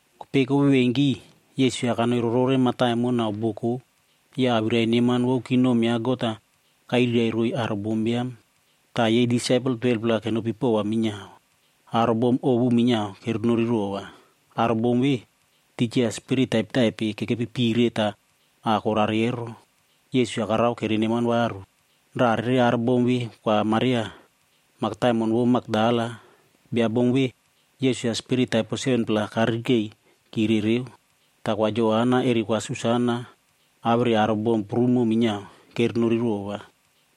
Kopei kovevenki, Yesus-a kanoi rorore mataimon nau boko ya awirai neman vou kingdom ya God-a kairirai roiy aro bombiam. Ta yei disaipel 12-pla kenopi pova minyiao. Aro bom ovu minyiao kerenori rova. Aro bom ve, tija spirit taipetaipe kekepi pire ta a korare ero, Yesus-a karao kereneman varu. Raꞌa rere aro bom ve Kwa Maria, mataimon vou Makdala. Bia bom ve, Yesus-a spirit taipo 7-pla karirikei kire reu. Ta Kwa Joana eri Kwa Susana awere aro bom prumo minyiao, kerenori rova.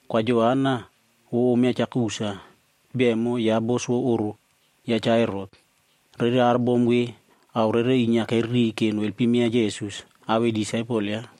Kwa Joana vou om ya Cha Kusa, bia emo yaꞌa bos vou oꞌro ya Cha Herot. Rere aro bom ve ao rere inyia kereriy ke noelpim yaꞌa Yesus awei disaipel yaꞌa.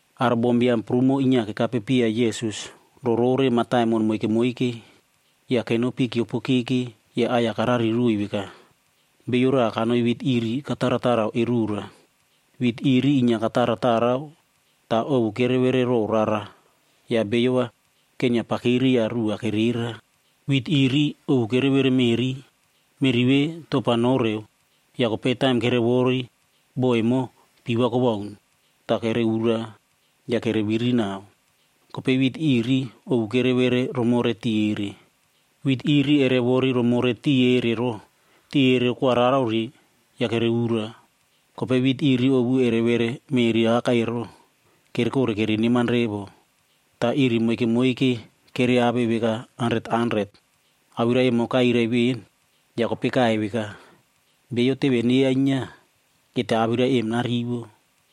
Aro bombiam prumo inyia kekape piya Yesus rorore mataimon moike moike. Ya kenopi kyiopokeke ya aꞌai-ya karari roiy veka, “Bio raꞌa kanoi wit iri kataratarao erora. Wit iri inyia kataratarao ta ovu kerevere row rara ya beiyo va kenyia pakiri ya ruꞌu va kerera. Wit iri ovu kerevere meꞌri. Meꞌri ve topa nore ya kopei taim kerewori, bo emo pii va kowaun ta kere ura ya kereviri nau. Kopei wit iri ovu kerevere romore tiꞌi erere. Wit iri erewori romore tiꞌi erere ro, tiꞌi erere kwararore ya kere ura. Kopei wit iri ovu kerevere row meꞌri awakai evo, kerekore kereneman revo. Ta iri moike moike kereave veka hanret hanret.” Awirai em kairai ven, ya kopei kaiy veka, “Bio teve neyainyia, keta awirai em narivo.”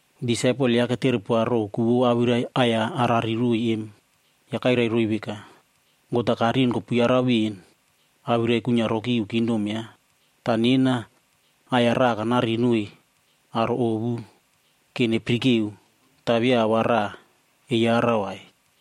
Disaipel yaꞌa ketere poa row ku vou awirai aꞌai-ya arari roiy em. Ya kairai roiy veka, “God-a karin kopuyarau ven awirai kuinyia roki iu kingdom yaꞌa. Ta nena aꞌai-ya raꞌa kanari noiy aro ovua ‘ke nepirikeo, ta via ao va raꞌa eyarau vai.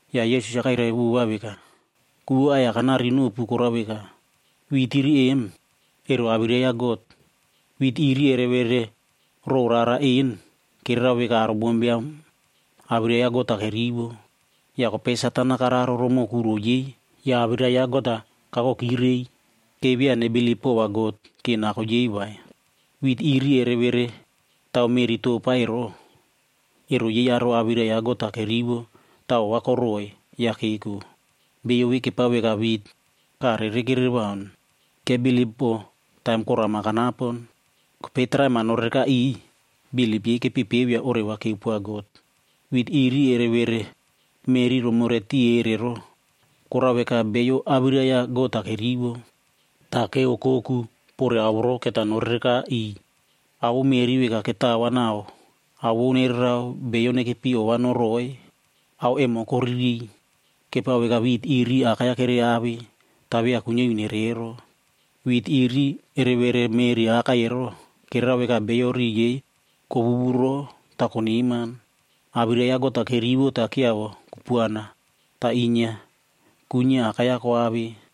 Ya Yesus-a kairai vova veka, “Ku vou aꞌai-ya kanari nopu korao veka, wit iri em, ero awirai ya God. Wit iri kerevere row rara en, kererao veka aro bombiam awirai ya God-a kerivo. Ya kopei Satan-a kararo romoꞌo kuro yei ya awirai ya God-a kakoki rei, ke via nebilip pova God ke nako yei vai. Wit iri kereveretao meꞌri topa ero, ero yei aro awirai ya God-a kerivo ta ova koroꞌoi ya keko. Beiyo ve kepao veka wit, kaꞌa rere kerewaun. Kebilip po taim korama kanapon, kopei traim-a norereka iꞌiy, bilip yei kepepeo ya oreva keupoa God. Wit iri kereveretao meꞌri romore tiꞌi erere ero, korao veka beiyo awirai ya God-a kerivo. Ta keokoku pore ao voro keta norereka iꞌiy. Ao vou meꞌri veka ketao va nau ao vou nererao beiyo nekepi ova noroꞌoi, ao emo koririy. Kepao veka wit iri akai-ya kereave, ta via kuinyia iu neiyoro. Wit iri kereveretao meꞌri awakai ero, kererao veka beiyo riꞌi yei kowuwurow ta koneman. Awirai ya God-a kerivo ta kyiavo kupuana ta inyia kuinyia akai-ya koave.”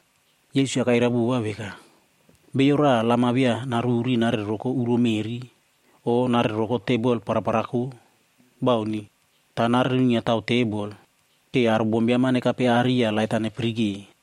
Yesus-a kairai vova veka, “Bio raꞌa lam-a via aruri arere roko uro meꞌri o arere roko tebol paraparako. Bauni. Ta narere nuinyiatao tebol, ke aro bombiam-a nekape aꞌari ya lait-a nepirike.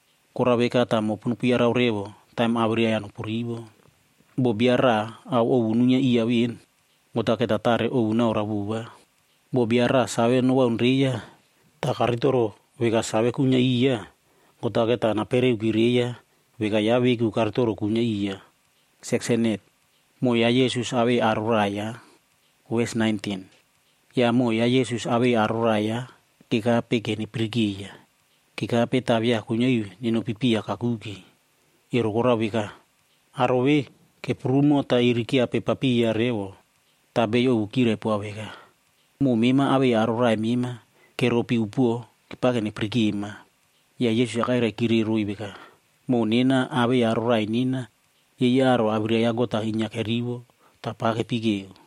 Korao veka ta mopu nopuyarau revo taim awirai-ya nopurivo. Bo bio raꞌa ao ovu nuinyia iya ven, God-a keta tare ovu naoroa vova. Bo bio raꞌa save nowaunreiya, ta karitoro veka save kuinyia iya, God-a keta napereoki reiya veka yaꞌa veku karitoro kuinyia iya.” Moꞌo ya Yesus awei aro raꞌai yaꞌa. Ya moꞌo ya Yesus-a awei aro raꞌai yaꞌa kekape ke nepirikeiya. Kekape ra via kuinyia iu nenopi piya kakuke, ero korao veka, aro ve keprumoki ta iri kyiapepariya revo. Ta beiyo ovu kyirai poa veka, “Moꞌo mema awei aro raꞌai mema keropi upuo kepake nepirikema.” Ya Yesus-a kairaikiroiy veka, “Moꞌo nena awei aro raꞌai nena, yei aro awirai ya God-a inyia kerivo ta pa kepekeo.”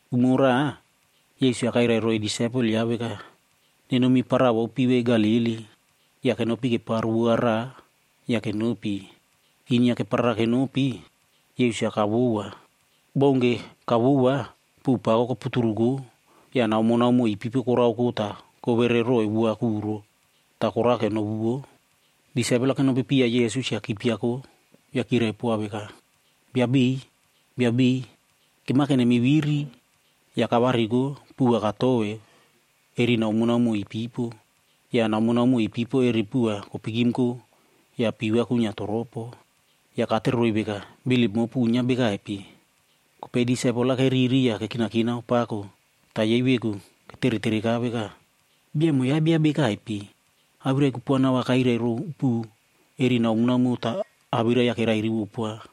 Umo raꞌa Yesus-a kairai roiy disaipel yaꞌa veka, “Nenomi para vou pivei Galili.” Ya kenopi keparo bot raꞌa ya kenopi. Inyia keparara kenopi, Yesus-a kavowoa. Bounke kavowoa, puꞌu pako koputuruko ya naomonaomo ipipo koraoko ta kowere roiy bot kuro ta korake novuvo. Disaipel-a kenopi piya Yesus ya kipiako ya kyirai poa veka, “Bia beiy, Bia beiy, kemake nemiviri!” Ya kavariko puꞌu va katoveu eri naomonaomo ipipo. Ya naomonaomo ipipo eri puꞌu va kopikimko ya pii va kuinyia toropo. Ya katere roiy veka, “Bilip mopu uinyia bekaipe?” Kopei disaipel-a keriri ya kekinakinao pako ta yei veku keteretereka veka, “Bia emo yaꞌa bia bekaipe, awirai kupuana va kairai row puꞌu eri naomonaomo ta awirai-ya kerairivo poa?”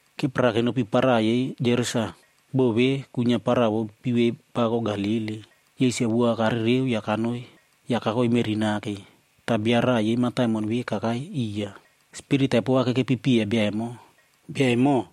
Keparara kenopi para yei Gerasa. Bo ve kuinyia para vou pivei pako Galili. Yesus-a bot-a karereo ya kakoi meꞌri nake, ta bio raꞌa yei mataimon ve kakai iya. Spirit taipo va kerekeri iya bio emo. Bio emo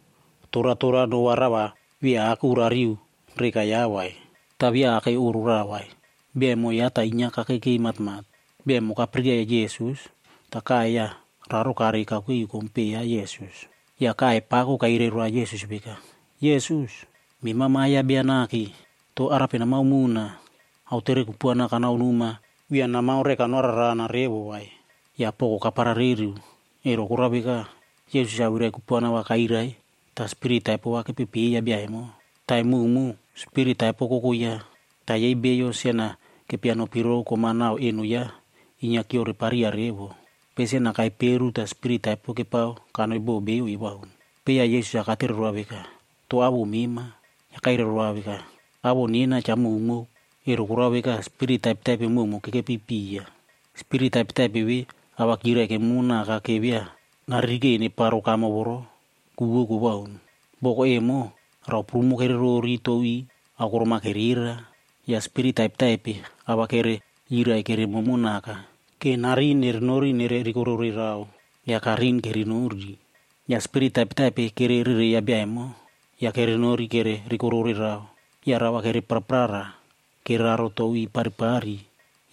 toratora no va raꞌa va via aku rariu reka yaꞌa vai. Ta via akei oꞌro raꞌa vai. Bio emo yaꞌa ta inyia kakekei matmat. Bio emo kapirikeiya Yesus, ta kaiy ya raro karei kakuke iu kompeꞌe ya Yesus. Ya kaiy pako kairai roa Yesus veka, “Yesus, mema Ma Biam ya God Bia Nake! To arape namaomona? Aotere kupuana kanaonoma via namao reka noararana revo vai.” Ya poko kaparareru, ero korao veka, Yesus-a awirai kupuana va kairai ta spirit taipo va kererereiya bio emo. Taim mowmow, spirit taipo koko yaꞌa. Ta yei beiyo sen-a kepia nopiro kom-a nau eno yaꞌa ero, inyia kyiorepariya revo. Kopei sen-a kaiperu ya spirit taipo kererao kanoi bo beiyo ewaun. Kopei ya Yesus-a katere roa veka, “To awoꞌo mema?” Ya kairai roa veka, “Awoꞌo nena Cha Mowmow.” Ero korao veka spirit taipetaipe mowmow kerekeri iya. Spirit taipetaipe ve awirai-ya kyirai kemomonaka ke via naririkei neparo kamo voro ku vou kowaun. Boko emo, rao prumo kererori tou iꞌ aokorom-a kerera. Ya spirit taipetaipe a va kereyirai keremomo naka ke narin nerenori nere rikorore rao, ya karin kerenori. Ya spirit taipetaipe kererereiya bia emo, ya kerenori kere rikorore rao. Ya rao va kere praprara kereraro tou iꞌ paripari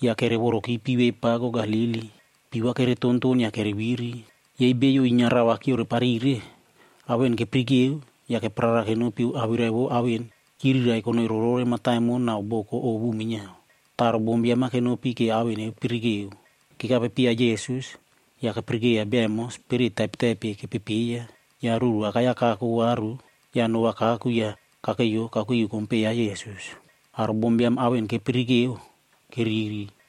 ya kerevoroki pivei pako Galili. Pii va keretonton ya kereviri. Yei beiyo inyia rao va kyioreparire, ao en kepirikeo ya kepraprara kenopi awirai vou ao en kyirirai konoi rorore mataimon nau boko ovu minyiao. Ta aro bombiam-a kenopi ke ao en nepirikeo. Kekape piya Yesus, ya kepirikeiya bia emo spirit taipetaipe kererereiya. Ya ruru awakai-ya kako varu ya no va kaku ya kakeiyo kakuke iu kompeꞌe ya Yesus. Aro bombiam ao en kepirikeo keriri.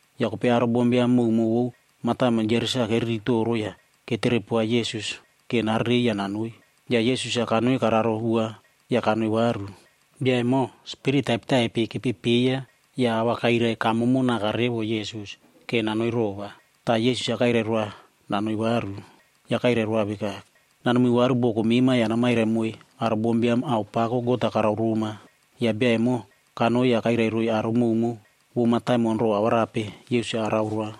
Ya kopei aro bombiam mowmow vou mataimon Gerasa keriri toro ya ketere poa Yesus ke narerei ya nanoi. Ya Yesus-a kanoi kararo bot ya kanoi varu. Bia emo spirit taipetaipe kererereiya, ya a va kairai kamomo naka revo Yesus ke nanoi rova. Ta Yesus-a kairai roa nanoi varu. Ya kairai roa veka, “Nanomi varu boko mema ya namairai moiy aro bombiam ao pako God-a karao roma.” Ya bia emo kanoi ya kairai roiy aro mowmow vou mataimon row ao arape Yesus-a arao roa.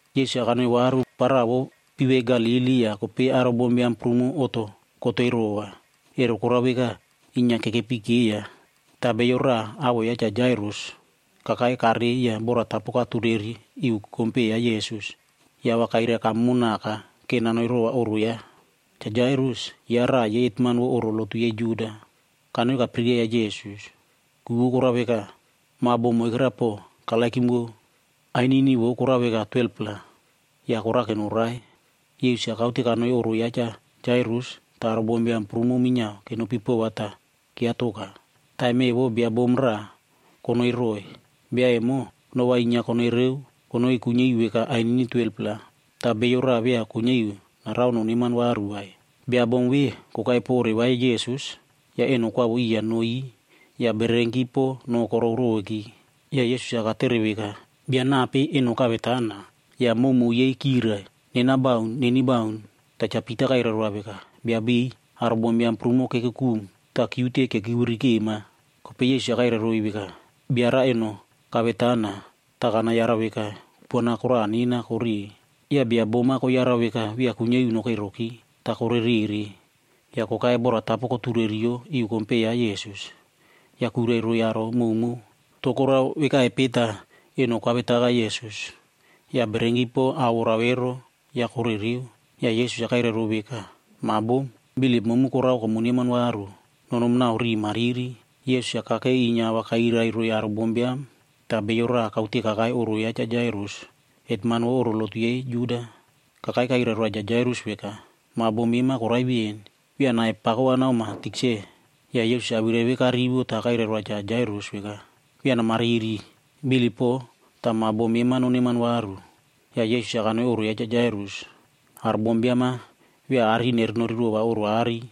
Yesus-a kanoi varu para vou pivei Galili ya kopei aro bombiam prumo oꞌto kotei rova. Ero korao veka, inyia kekepikeiya. Ta bio raꞌa awoꞌo yaꞌa Cha Jairus kakai karei ya boratapo katureri iu kompeꞌe ya Yesus ya a va kairai kamomo naka ke nanoi rova oꞌro yaꞌa. Cha Jairus, yaꞌa raꞌa yei hetman vou oꞌro lotu yei Juda. Kanoi kapirikeiya Yesus, ku vou korao veka, ma bom moikera po karererow, ainini vou korao veka 12-pla. Ya korake norai. Yesus-a kaute kanoi oꞌro ya Cha Jairus, ta aro bombiam prumo minyiao kenopi pova ta kyiatoka. Taim evo bia bom raꞌa konoi roiy. Bia emo, noꞌo va inyia konoi reu konoi kuinyia iu veka ainini 12-pla.c Ta bio raꞌa via kuinyia iu narao noneman varu vai. Bia bom ve kokai po oreva ya Yesus, ya eno kwavo iya no iꞌ ya bererenki po noꞌo korow roveki. Ya Yesus-a katere veka, “Bia nape eno kavetana?” Ya mowmow yei kyirai, “Nena bauni. Neni bauni.” Ta Cha Pita kairai roa veka, “Bia beiy, aro bombiam prumo kekukum ta kyiute kekivirikema.” Kopei Yesus-a kairai roiy veka, “Bia raꞌa eno kavetana ta kanayarau veka, kupuana koraꞌa nena koreꞌe.” Ya bia bom-a koyarau veka via kuinyia iu nokei roki vai, ta korerere ya kokai boratapo kotureriyo iu kompeꞌe ya Yesus. Ya kuirai roiy aro mowmow row ku vou eno koavetaka Yesus ya bererenki po a orao ero ya korereo. Ya Yesus-a kairai row veka, “Ma bom, bilip momu korao komuneman varu. Nonomi nau riꞌi mariri.” Yesus-a kakei inyia a va kairai roiy aro bombiam ta bio raꞌa kaute kakai oꞌro ya Cha Jairus, hetman vou oꞌro lotu yei Juda. Kakai kairai roa Cha Jairus veka, “Ma bom mema korai ven, via nai-ya naomoa tikse vai.” Ya Yesus-a awirai ve karivo ta kairai roa Cha Jairus veka, “Via namariri, bilip po, ta ma bom mema noneman varu.” Ya Yesus-a kanoi oꞌro ya Cha Jairus. Aro bombiam-a via arin erenori rova oꞌro aꞌari.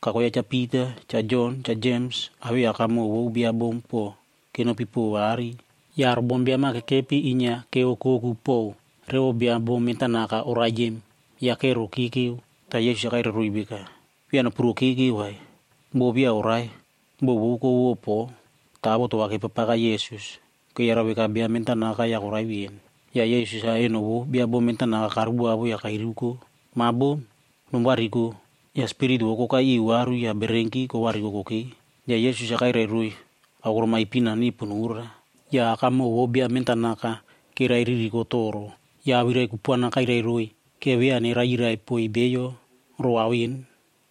Kako yaꞌa Cha Pita, Cha Jon, Cha Jems, awei akamoꞌo vou bia bom ve po kenopi pova aꞌari. Ya aro bombiam-a kekepi inyia keokoku pow revo bia bom mentanaka orai em ya kerokekeu. Ta Yesus-a kairai roiy veka, “Via nopurokekeu vai, bo via orai, bo vou kovovo po.” Ta avoto va kepapaka Yesus, keyarau veka bia mentanaka ya korai ven. Ya Yesus-a eno vou bia bom mentanaka karuvavo ya kairiuko, “Ma bom, nomuvariko!” Ya spirit vou kokai iu varu ya bererenki kovariko kokei. Ya Yesus-a kairai roiy aokorom ipin-a nepo nora. Ya akamoꞌo vou bia mentanaka evo keraiririko toro ya awirai kupuana kairai roiy ke via neraiyirai poiy beiyo row ao en.